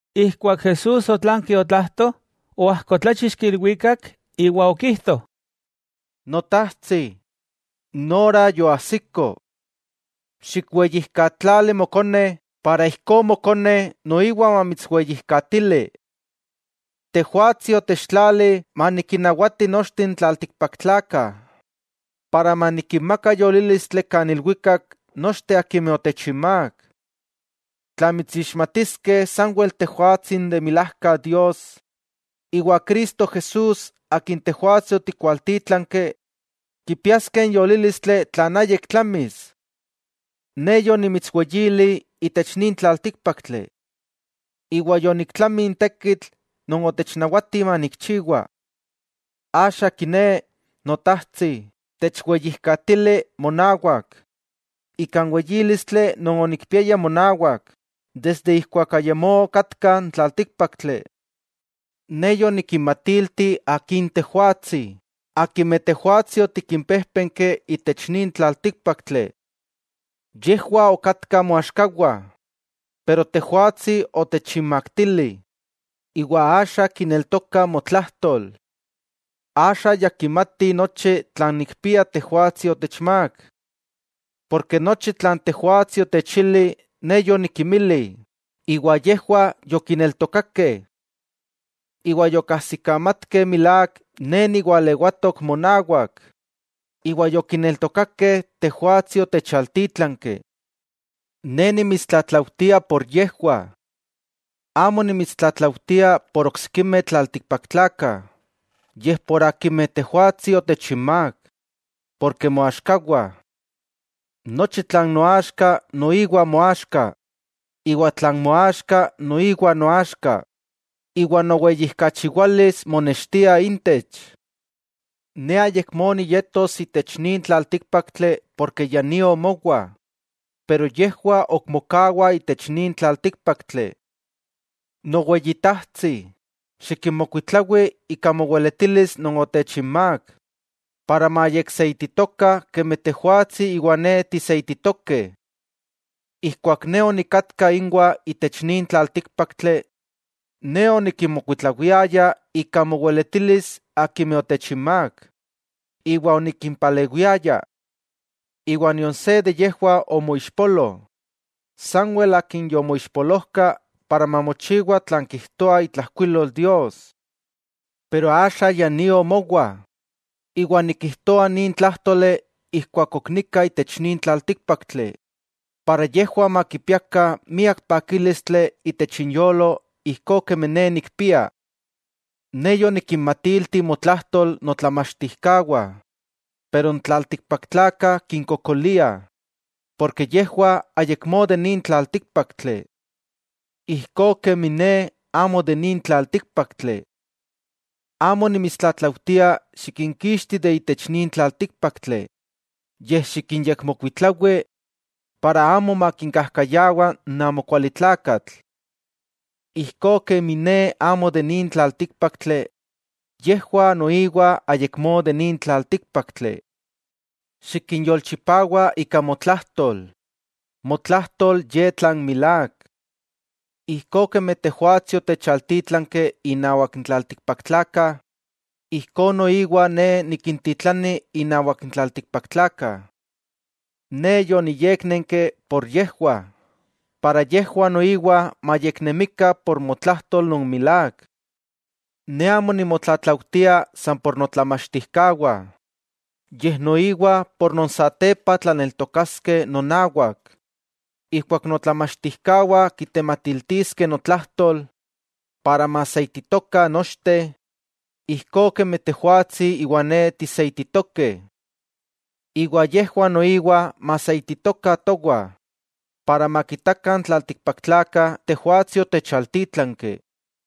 Ijkuak Jesús otlanki otlajto, oajkotláchixki ilwikak iwa okijto: —Notajtsi, n ora yoajsiko. Xikweyijkatlali Mokone para ijkó Mokone noiwa mamitsweyijkatili. Tejwatsi otechtlali manikinnawati nochteh n tlaltikpaktlakah, para manikinmaka yolílistli kan ilwikak nochteh akimeh otechinmák. Tla mitsixmatiskeh sanwel Tejwatsi n de milajka Dios, iwa Cristo Jesús, Akin Tejwatsi otikwaltítlanki, kipiaskeh n yolílistli tlan ayik tlamis. 'Ne yonimitsweyili itech nin tlaltíkpaktli. Iwa yoniktlami n tekitl non otechnawati manikchiwa. Axa kiné, Notajtsi, techweyijkatili monawak, ika n weyílistli non onikpiaya monawak desde ijkuak ayamó okatka n tlaltíkpaktli. 'Ne yonikinmatilti Akin Tejwatsi akimeh Tejwatsi otikimpéjpenki itech nin tlaltíkpaktli. Yejwah okatkah moaxkawah, pero Tejwatsi otechinmaktili, iwa axa kineltokah motlajtol. Axa ya kimatih nochi tlan nikpia Tejwatsi otechmák. Porke nochi tlan Tejwatsi otechili, Ne yonikinmili, iwa yejwah yokineltokakeh. Iwa yokajsikamatkeh milák Ne niwalewatok monawak, iwa yokineltokakeh Tejwatsi otechaltítlanki. 'Ne nimitstlatlaujtia por yejwah. Amo nimitstlatlaujtia por oksikimeh tlaltikpaktlakah, yej por akimeh Tejwatsi otechinmák, porke moaxkawah. Nochi tlan noaxka, noiwa moaxka, iwa tlan moaxka, noiwa noaxka, iwa noweyijkachiwalis monextia intech. 'Ne ayakmó niyetos itech nin tlaltíkpaktli porke ya nio mowa, pero yejwah ok mokawah itech nin tlaltíkpaktli. Noweyitajtsi, xikinmokuitlawi ika moweletilis non otechinmák, para mayekseititokah kemi Tejwatsi iwa Ne tiseititokeh. Ijkuak Ne onikatka inwah itech nin tlaltíkpaktli, Ne onikinmokuitlawiaya ika moweletilis akimeh otechinmák, iwa onikimpalewiaya. Iwa nion se de yejwah omoixpolo, sanwel akin yomoixpolojka para mamochiwa tlan kijtoa itlajkuilol Dios. 'Pero axa ya nio mowa, iwa nikijtoa nin tlájtoli ijkuak ok nika itech nin tlaltíkpaktli, para yejwah makipiakah miak pakílistli itech inyolo ijkó kemi Ne nikpia. Ne yonikinmatilti motlajtol notlamachtijkawah, pero n tlaltikpaktlakah kinkokoliah, porke yejwah ayakmó de nin tlaltíkpaktli. Ijkó kemi Ne amo de nin tlaltíkpaktli. Amo nimitstlatlaujtia xikinkixti de itech nin tlaltíkpaktli, yej xikinyekmokuitlawi para amo makinkajkayawa n amokualitlakatl. Ijkó kemi Ne amo de nin tlaltíkpaktli, yejwah noiwa ayakmó de nin tlaltíkpaktli. Xikinyolchipawa ika motlajtol, motlajtol ye tlan milák. Ijkó kemi Tejwatsi otechaltítlanki innawak n tlaltikpaktlakah, ijkó noiwa Ne nikintitlani innawak n tlaltikpaktlakah. Ne yoniyéknenki por yejwah, para yejwah noiwa mayeknemikah por motlajtol non milák. 'Ne amo nimotlatlaujtia san por notlamachtijkawah, yej noiwa por non satepa tlaneltokaskeh nonawak, ijkuak notlamachtijkawah kitematiltiskeh notlajtol, para maseititokah nochteh, ijkó kemi Tejwatsi iwa Ne tiseititokeh. Iwa yejwah noiwa maseititokah towah, para makitakah n tlaltikpaktlakah Tejwatsi otechaltítlanki.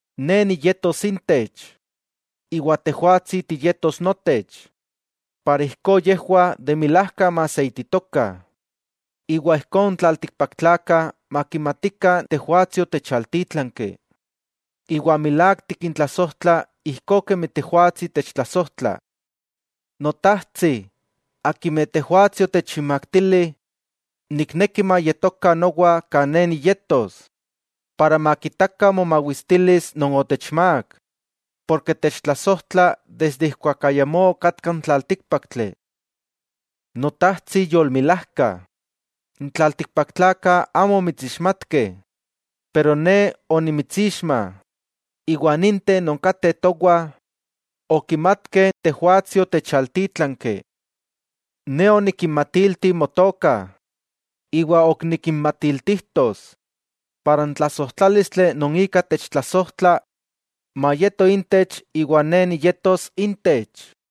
Ne niyetos intech, iwa Tejwatsi tiyetos notech, para ijkó yejwah de milajka maseititokah. Iwa ijkó n tlaltikpaktlakah makimatikah Tejwatsi otechaltítlanki, iwa milák tikintlasojtla ijkó kemi Tejwatsi techtlasojtla. 'Notajtsi, akimeh Tejwatsi otechinmaktili, nikneki mayetokah nowa kan Ne niyetos, para makitakah momawistilis non otechmák, porke techtlasojtla desde ijkuak ayamó okatka n tlaltíkpaktli. Notajtsi yolmilajka, n tlaltikpaktlakah amó omitsixmatkeh. Pero Ne onimitsixma, iwa ninteh non kateh towah okimatkeh Tejwatsi otechaltítlanki. Ne onikinmatilti motoka, iwa ok nikinmatiltijtos, para n tlasojtlálistli non ika techtlasojtla mayeto intech iwa Ne niyetos intech.